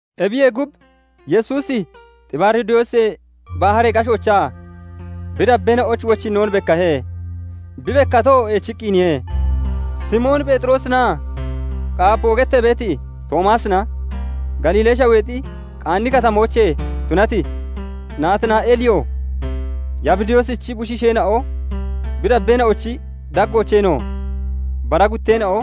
Ebiyee gub, Yesuusi Xibaaridoosee Baharee gashoochaa bi dabbeena'oyich wochinnoon bekkahe; bi bekkatoo eechiqqiniye: Simoon Pheexirosinaa "Qaapoo" gettee beeti Toomaasina, Galiilee Shaweexi Qaani Katamoochee tunati Naatinaa'eeliyo, Yabidoosichi bushiisheena'o, bi dabbeena'ochi daggoocheenoo bara gutteena'o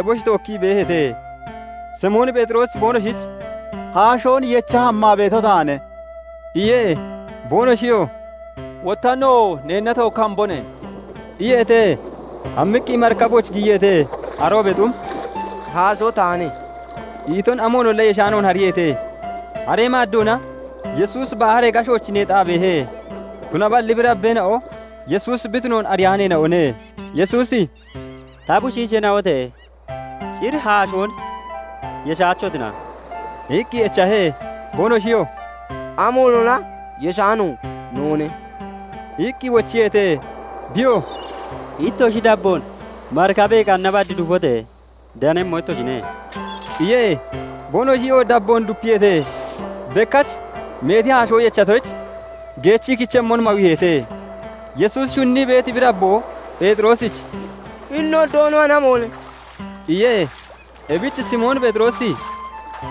eboshi tookkii beeheete. Simoon Pheexiroosi boonoshich "Haashoon yecha hammaa beeto taane" iye. Boonoshiyoo "Wotta nowoo neenna tookki hambone" iyeete. Hammiqqi marikabooch giyiyeete; aroobee xum "Haashoo taane" iton amoonolla yeshaanoon hariiheete. Haree maaddoona, Yesuusi baharee gashooch neexaa beehe; tunaballi bi dabbeena'o Yesuusi bi tunoon ariyaaneena'one. Yesuusi "Ta bushiisheena'ote! Cir haashoon yeshaachotina?" iqqi echahe. Boonoshiyoo "Amoonolla yeshaano noone" iqqi wochiyeete. Biyoo "Ittoshi dabboon marikabee qanna bad dufote! Danemmo ittoshine" iye. Boonoshiyoo dabboon dupiyeete; bekkach meeti haashoo yechatoyich, geechi kichemmon mawiiheete. Yesuusi shunnii beeti bi dabboo Pheexiroosich "Hini no Doonoalli amoone!" iye. Ebich Simoon Pheexiroosi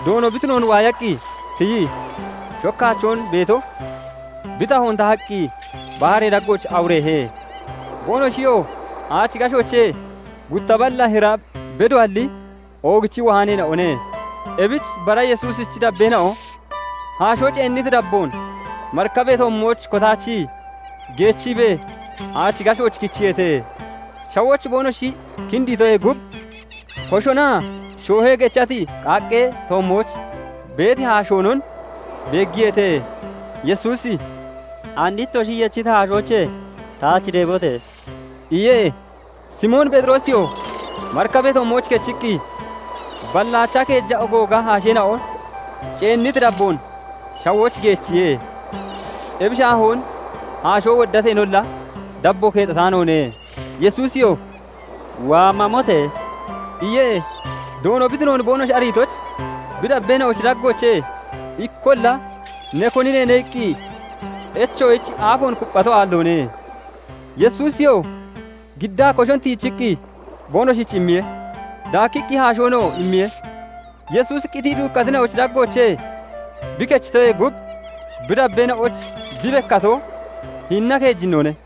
Doono bi tunoon waayaqqi tiyii shokkaachoon beeto bi tahoon tahaqqi baharee daggooch awureehe. Boonoshiyoo aachi gashoochee gutta balla hira bedoalli oogichii wohaaneena'one. Ebich bara Yesuusichi dabbeena'o haashoo ceenniti dabboon marikabee toommooch kotaachii geechiibee aachi gashooch kichiyeete. Shawooch boonoshi kinditoyee gub, koshonaa shoohee gechati qaaqqee toommooch beeti haashoonon beeggiyeete. Yesuusi "And ittoshi yechiti haashoochee taach deebote!" iye. Simoon Pheexiroosiyoo marikabee toommooch kechiqqi balli aachaa keeja ogooga haasheena'o ceenniti dabboon shawooch geechiye; ebi shaahoon haashoo woddateenolla dabbo keexataanoone. Yesuusiyoo "Waa mamote!" iye. Doono bi tunoon boonoshi ariitoyich, bi dabbeena'ochi daggoochee ikkolla "Ne koni neene?" iqqi echoyich aafoon kupphato aalloone. Yesuusiyoo giddaa koshon tiijiqqi boonoshich immiye; daakkiqqi haashoonoo immiye. Yesuusi qitii duukkatina'ochi daggoochee bi kechitoyee gub, bi dabbeena'oyich bi bekkato hinina keejinnoone.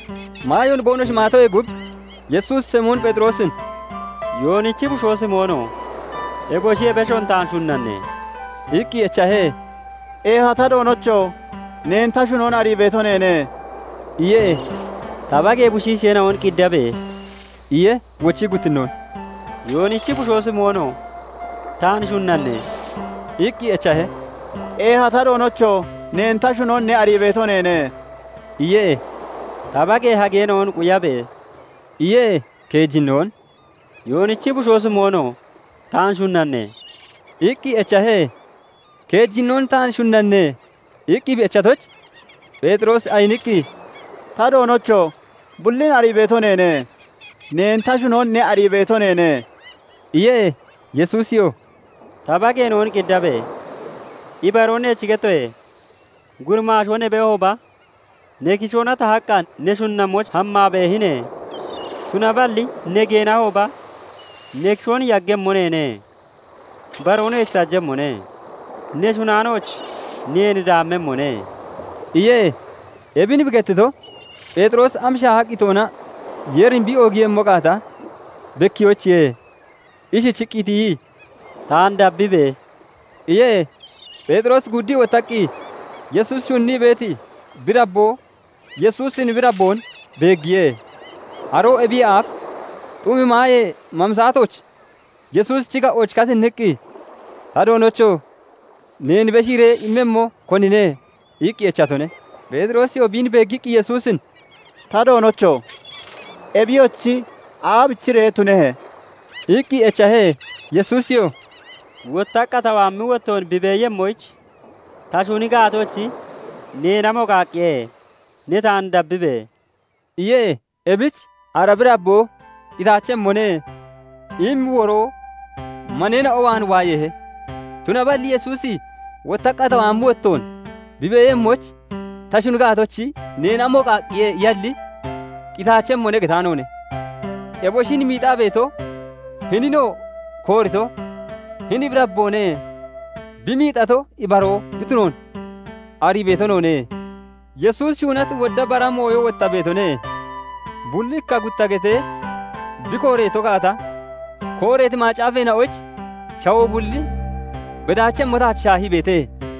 Maayoon boonoshi maatoyee gub, Yesuusi Simoon Pheexiroosin "Yoonichi bushoo Simoono! Eboshiye beshoon taan shunnanne?" iqqi echahe. "Eeha ta Doonocho! Neen ta shunon ne arii beeto neene" iye. "Ta bagee bushiisheena'on qiddabe!" iye. Wochii guttinnoon "Yoonichi bushoo Simoono! Taan shunnanne?" iqqi echahe. "Eeha ta Doonocho! Neen ta shunon ne arii beeto neene" iye. "Ta bagee hageena'on quyabe!" iye. Keejinnoon "Yoonichi bushoo Simoono! Taan shunnanne?" iqqi echahe. Keejinnoon "Taan shunnanne?" iqqi bi echatoyich, Pheexiroosi ayiniqqi, "Ta Doonocho! Bullin arii beeto neene; neen ta shunon ne arii beeto neene" iye. Yesuusiyoo "Ta bageena'on qiddabe! Ibaroon neech gettoye; guramaashoo ne beehooba, ne kishoona tahaqqa ne shunnammooch hammaa beehine. Tunaballi ne geenahooba, ne kishoon yaggemmo neene; baroo neech tajemmone; ne shunnaanooch neen daamemmone" iye. Ebin bi gettito, Pheexiroosi am shaaha qitoona Yeerin bi oogiiyemmo gaata bekkiyoyichiye. Ishichiqqi tiyii, "Taan dabbibe!" iye. Pheexiroosi guuddii wottaqqi Yesuusi shunnii beeti bi dabboo Yesuusin bi dabboon beeggiye; aroo ebiyee aaf xumi maayee mami saatooch Yesuusichi ga'ooch katinniqqi, "Ta Doonocho! Neen beshiiree immemmo konine?" iqqi echatone. Pheexiroosiyoo biin beeggiqqi Yesuusin "Ta Doonocho! Ebiyochi aabichiree tunehe?" iqqi echahe. Yesuusiyoo "Wottaqqa ta waammi wottoon bi beeyemmoyich ta shuni gaatochi, neen amo qaaqqiye? Ne taan dabbibe!" iye. Ebich "Ara bi dabboo qitaachemmone" immi woroo maneena'o waan waayeehe; tunaballi Yesuusi "Wottaqqa ta waammi wottoon bi beeyemmoyich ta shuni gaatochi, neen amo qaaqqiye?" iyalli, "Qitaachemmone" getaanoone. Eboshin miixaa beeto, hininoo koorito hini bi dabboone; bi miixato ibaroo bi tunoon arii beeto noone. Yesuusi shuunati wodda bara mooyo wotta beetone; bulli ikka gutta getee bi kooreeto gaata, kooreeti macaafeena'oyich shawoo bulli bedaachemmo taach shaahii beete.